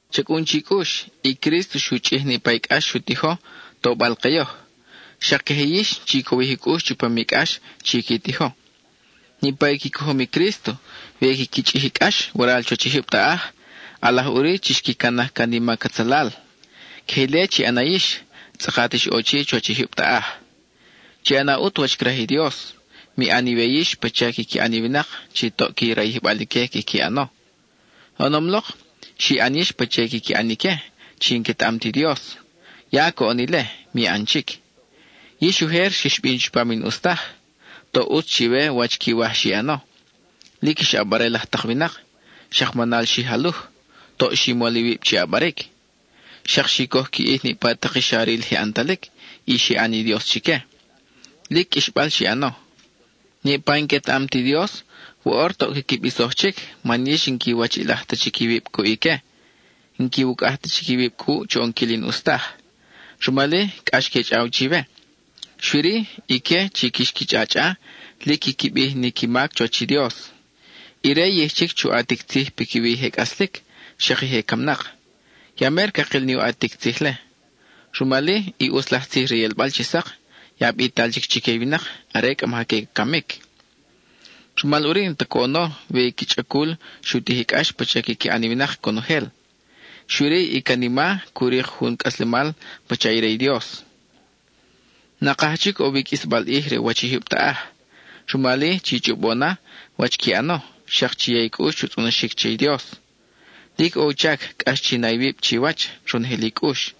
Cha cʼun chi cʼux, i Crísto xu chʼij niʼpa i cʼax xu tijo, tobal ke yoj. Xak queje yix, chi cowij i cʼux chupam i cʼax chi qui tijo. Niʼpa i qui cojom i Crísto, we quiqui chʼij i cʼax waral chuwach i jyub taʼaj, ʼalaj ʼuri chi xqui canaj can i mac atzalal. Queje ile chi ʼana yix, tzʼakat ix ʼo chi chuwach i jyub taʼaj. Chi ʼana ʼut wach craj i Dios; mi ʼan iwe yix pacha quiqui ʼan i winak chi toʼ qui rayijbal ique quiqui ʼano. Oʼonom lok, xi ʼan yix pacha i quiqui ʼan ique chi n-quetaʼam ti Dios; ya coʼon ile, mi ʼan chic. Yix ujer xix bin chupam i n-ʼus taj; toʼ ʼutz chiwe wach quiwaj xi ʼano; lic ix ʼabarel laj tak winak; xak manal xi jaluj; toʼ xi mol iwib chi ʼabaric. Xak xi coj qui ʼij niʼpa tak i xa ril je ʼantalic y xi ʼan i dios chique; lic qʼuixbal xi ʼano. Niʼpa i n-quetaʼam ti Dios, woʼor toʼ quiqui bisoj chic man yix n-quiwachiʼilaj ta chic iwib cuʼ ique. N-quiwucʼaj ta chic iwib cuʼ chu ʼonquil i n-ʼus taj. Rumal-i, cʼax que chʼaw chiwe. Xui-ri, ique chi quix qui chʼachʼa, lic quiqui bij ni qui mac chuwach i Dios. Ire yij chic chu ʼatic tzij piquiwi i je cʼaslic, xak i je camnak. Ya mer cakil ni u ʼatic tzij-le; rumal-i, i ʼutz laj tzij re i ʼelbal chi sak, ya bital chic chique i winak are cʼa maja que camic. Rumal ʼuri, n-ta coʼono we i qui chʼacul xu tij i cʼax pacha quiqui ʼan i winak conojel, xui-ri, i canima cu rik jun u cʼaslemal pacha i re i Dios. Nakaj chic ʼo wi i qʼuisbal ʼij re u wach i jyub taʼaj. Rumal-i, chi chʼobo na wach qui ʼano, xak chi ya i cʼux chu tzʼonoxic che i Dios. Lic ʼo u chac cʼax chi na iwib chiwach, ronojel i cʼux.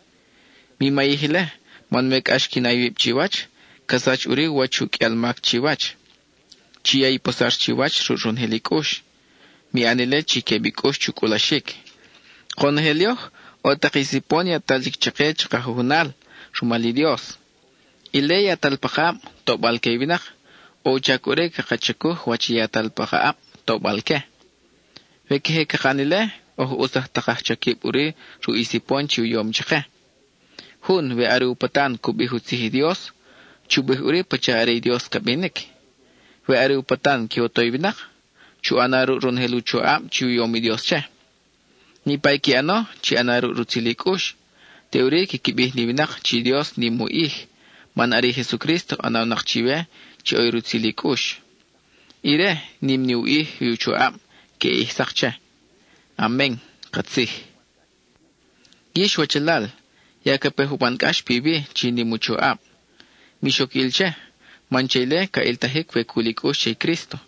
Mi mayij ile, man we cʼax qui na iwib chiwach, ca sach ʼuri u wach u qʼuial mac chiwach. Chi ya i posar chiwach ruʼ ronojel i cʼux; mi ʼan ile chi queb i cʼux chu cʼulaxic. Konojel yoj, ʼo tak i sipon yatal chic chake chaka jujunal rumal i Dios. Ile yatal pakaʼab, tobal que i winak, ʼo u chac ʼuri caka chacuj wach i yatal pa ka ʼab, tobal que. We queje caka ʼan ile, oj ʼutz laj tak aj chaquib ʼuri ruʼ i sipon chi u yom chake. Jun, we are u patan cu bij u tzij i Dios, chu bij ʼuri pacha are i Dios ca binic. We are u patan que u to i winak, chu ʼana ruʼ ronojel u choʼab chi u yom i Dios che. Niʼpa i qui ʼano, chi ʼana ruʼ rutzil i cʼux, teʼuri quiqui bij ni winak chi Dios nim u ʼij, man are i Jesucrísto ʼanawnak chiwe chi ʼo rutzil i cʼux. Ire, nim ni u ʼij i u choʼab queʼe ʼij sak che. Amen (katzij). Yix wachalal, ya ca pe juban cʼax piwi chi nim u choʼab. Mix oc ʼil che, man che ile ca ʼiltajic we cul i cʼux che i Crísto.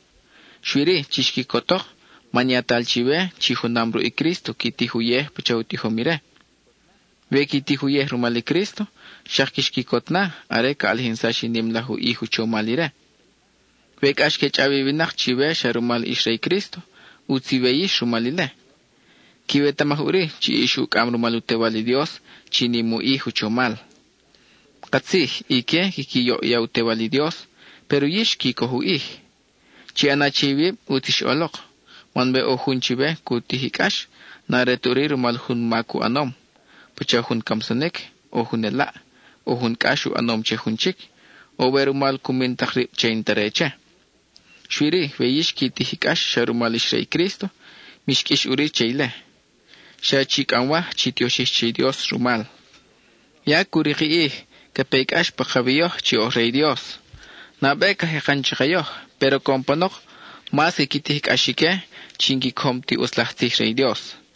Xui-ri, chix quicotok man yatal chiwe chi junam ruʼ i Crísto qui tij uyej pacha u tijom ire. We qui tij uyej rumal i Crísto, xak quix quicot na are ca ʼalijinsax i nim laj u ʼij u chomal ire. We cʼax que chʼaw i winak chiwe xa rumal ix re i Crísto, ʼutz iwe yix rumal ile. Quiwetamaj ʼuri chi ix ucʼam rumal u Tewal i Dios chi nim u ʼij u chomal. Katzij, ique quiqui yoʼya u Tewal i Dios, péro yix qui coj u ʼij. Chi ʼana che iwib ʼutz ix ʼolok, man we ʼo jun chiwe cu tij i cʼax, n-are ta ʼuri rumal jun mac u ʼanom, pacha jun camsanic, o jun elaʼ, o jun cʼax u ʼanom che jun chic, o we rumal cu min tak rib che i n-ta re che. Xui-ri, we yix qui tij cʼax xa rumal ix re i Crísto, mix qʼuix ʼuri che ile. Xa chi cʼamwaj chi tioxij che i Dios rumal. Ya cu rik i ʼij ca pe i cʼax pakawi yoj chi oj re i Dios. Nabe ca jekan chake yoj, péro coʼon panok, mas quiqui tij i cʼax ique chi n-qui cojom ti ʼutz laj tzij re i Dios.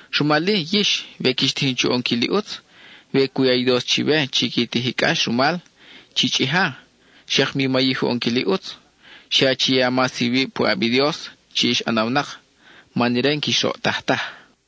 Rumal-i yix, we quix tijin chu ʼonquil i ʼutz, y we cu ya i Dios chiwe chi qui tij i cʼax rumal, chi chʼija, xak mi mayij u ʼonquil i ʼutz; xa chi ya mas iwib puʼab i Dios chi ix ʼanawnak, man ire n-quix roʼtaj taj.